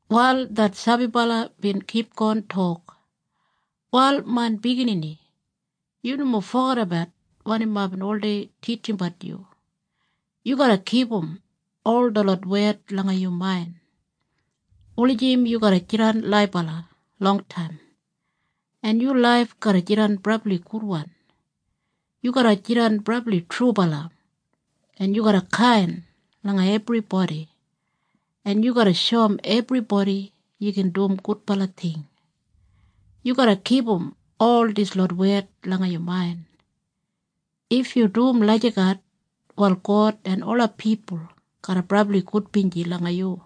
Wal det sabibala bin kipgon tok, “Wal main biginini, yu nomo fogedabat wanim aibin oldei titjimbat yu. Yu garra kipum ol detlot wed langa yu main, wulijim yu garra jidan laibala longtaim en yu laif garra jidan brabli gudwan. Yu garra jidan brabli trubala en yu garra kain langa ebribodi en yu garra shoum ebribodi yu gin dum gudbala ting. Yu garra kipum ol dislot wed langa yu main. If yu dum lagijat wal God en ola pipul garra brabli gudbinji langa yu.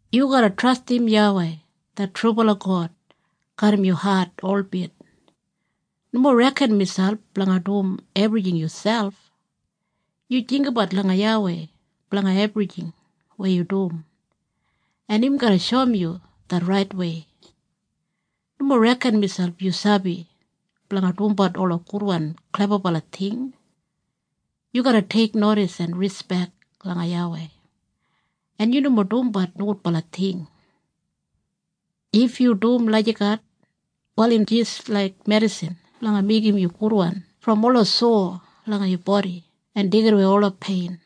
“Yu garra trastim YAWEI det trubala God garram yu hat holbit. Nomo reken miselp blanga dum ebrijing yuselp. Yu jinggabat langa YAWEI blanga ebrijing weya yu dum en im garra shoum yu det raitwei. Nomo reken miselp yu sabi blanga dumbat ola gudwan klebabala ting. Yu garra teiknodis en rispek langa YAWEI en yu nomo dumbat nogudbala ting. If yu dum lagijat, wal im jis laik medisin blanga meigim yu gudwan brom ola sowa langa yu bodi en deigidawei ola pein.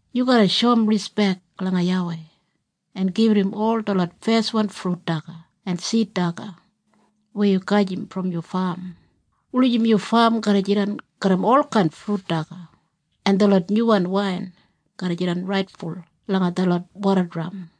Yu garra shoum rispek langa YAWEI en gibit im ol detlot feswan frut daga en sid daga weya yu gajim brom yu fam, wulijim yu fam garra jidan garram olkain frut daga en detlot nyuwan wain garra jidan raitful langa detlot wodadram.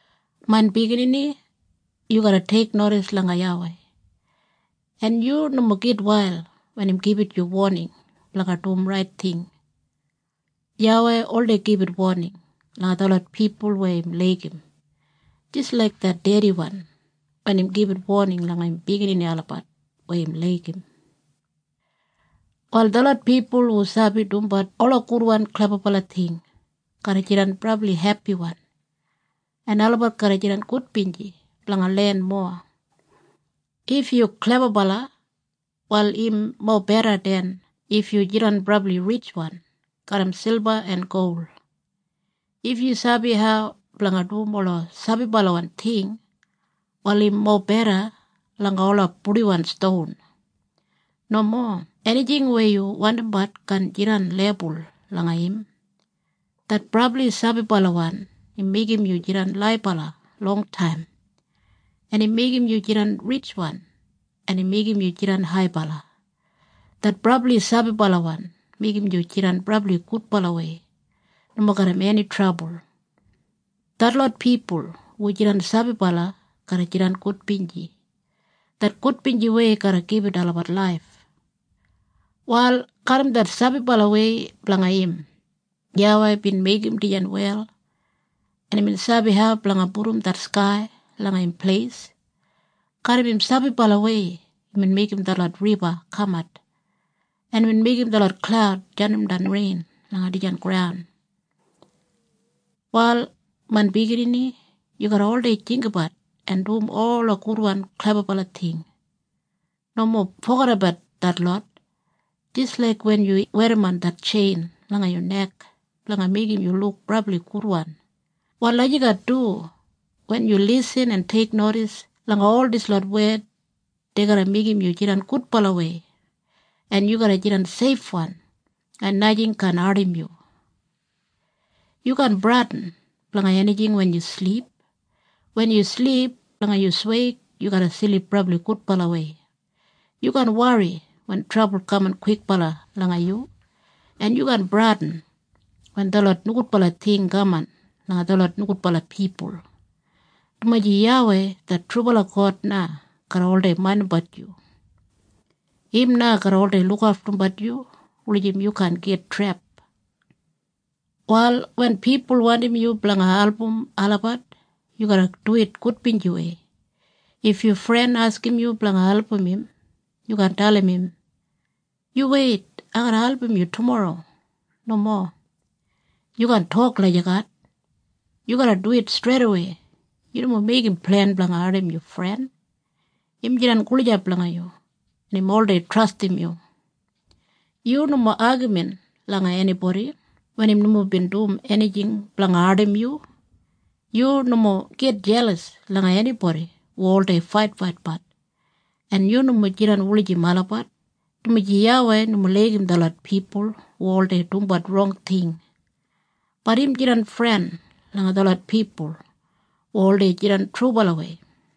“Main biginini, yu garra teiknodis langa YAWEI en yu nomo gitwail wen im gibit yu woning blanga dum rait ting. YAWEI oldei gibit woning langa detlot pipul weya im laigim jis laik det dediwan wen im gibit woning langa im biginini olabat weya im laigim. “Wal detlot pipul hu sabi dumbat ola gudwan klebabala ting garra jidan brabli hepiwan en olabat garra jidan gudbinji blanga len mowa. If yu klebabala wal im mobeda den if yu jidan brabli ritjwan garram silba en gol. If yu sabi hau blanga dum ola sabibalawan ting wal im mobeda langa ola purdiwan ston. Nomo enijing weya yu wandimbat kaan jidan lebul langa im. Det brabli sabibalawan im meigim yu jidan laibala longtaim en im meigim yu jidan ritjwan en im meigim yu jidan haibala. Det brabli sabibalawan meigim yu jidan brabli gudbalawei, nomo garram eni trabul. Detlot pipul hu jidan sabibala garra jidan gudbinji. Det gudbinjiwei garra gibit olabat laif. “Wal garram det sabibalawei blanga im, YAWEI bin meigim dijan wel, en imbin sabi hau blanga pudum det skai langa im pleis. Garram im sabibalawei imbin meigim detlot riba kamat en imbin meigim detlot klaud jandimdan rein langa dijan graun. “Wal main biginini, yu garra oldei jinggabat en dum ola gudwan klebabala ting. Nomo fogedabat detlot. Jis laik wen yu werrimon det tjein langa yu nek blanga meigim yu luk brabli gudwan, wal lagijat du wen yu lisin en teiknodis langa ol dislot wed dei garra meigim yu jidan gudbalawei, en yu garra jidan seifwan en najing kaan ardim yu. Yu kaan bradin blanga enijing wen yu silip. Wen yu silip langa yu sweig yu garra silip brabli gudbalawei. Yu kaan wori wen trabul kaman kwikbala langa yu, en yu kaan bradin wen detlot nogudbala ting kaman langa detlot nogudbala pipul, dumaji YAWEI det trubala God na garra oldei maindimbat yu. Im na garra oldei lukaftumbat yu wulijim yu kaan git trep. “Wal wen pipul wandim yu blanga album olabat yu garra duwit gudbinjiwei. If yu fren askim yu blanga album im yu kaan dalim im, ‘Yu weit! Ai garra album yu tumorro.’ Nomo. Yu kaan tok lagijat. Yu garra duwit streidawei. Yu nomo meigim plen blanga ardim yu fren. Im jidan gulijap langa yu en im oldei trastim yu. Yu nomo agamin langa enibodi wen im nomo bin dum enijing blanga ardim yu. Yu nomo git jelas langa enibodi hu oldei faitfaitbat, en yu nomo jidan wulijim olabat, dumaji YAWEI nomo laigim detlot pipul hu oldei dumbat rong ting, bat im jidan fren langa detlot pipul hu oldei jidan trubalawei.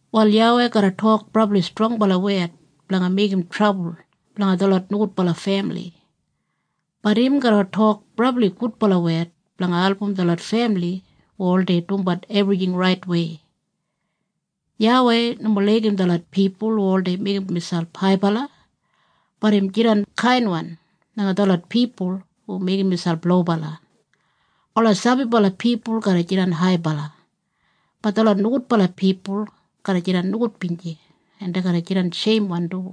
“Wal YAWEI garra tok brabli strongbala wed blanga meigim trabul blanga detlot nogudbala femili, bat im garra tok brabli gudbala wed blanga album detlot femili hu oldei dumbat ebrijing raitwei. YAWEI nomo laigim detlot pipul hu oldei meigim miselp haibala, bat im jidan kainwan langa detlot pipul hu meigim miselp lobala. Ola sabibala pipul garra jidan haibala, bat detlot nogudbala pipul garra jidan nogudbinji en dei garra jidan sheimwan du.”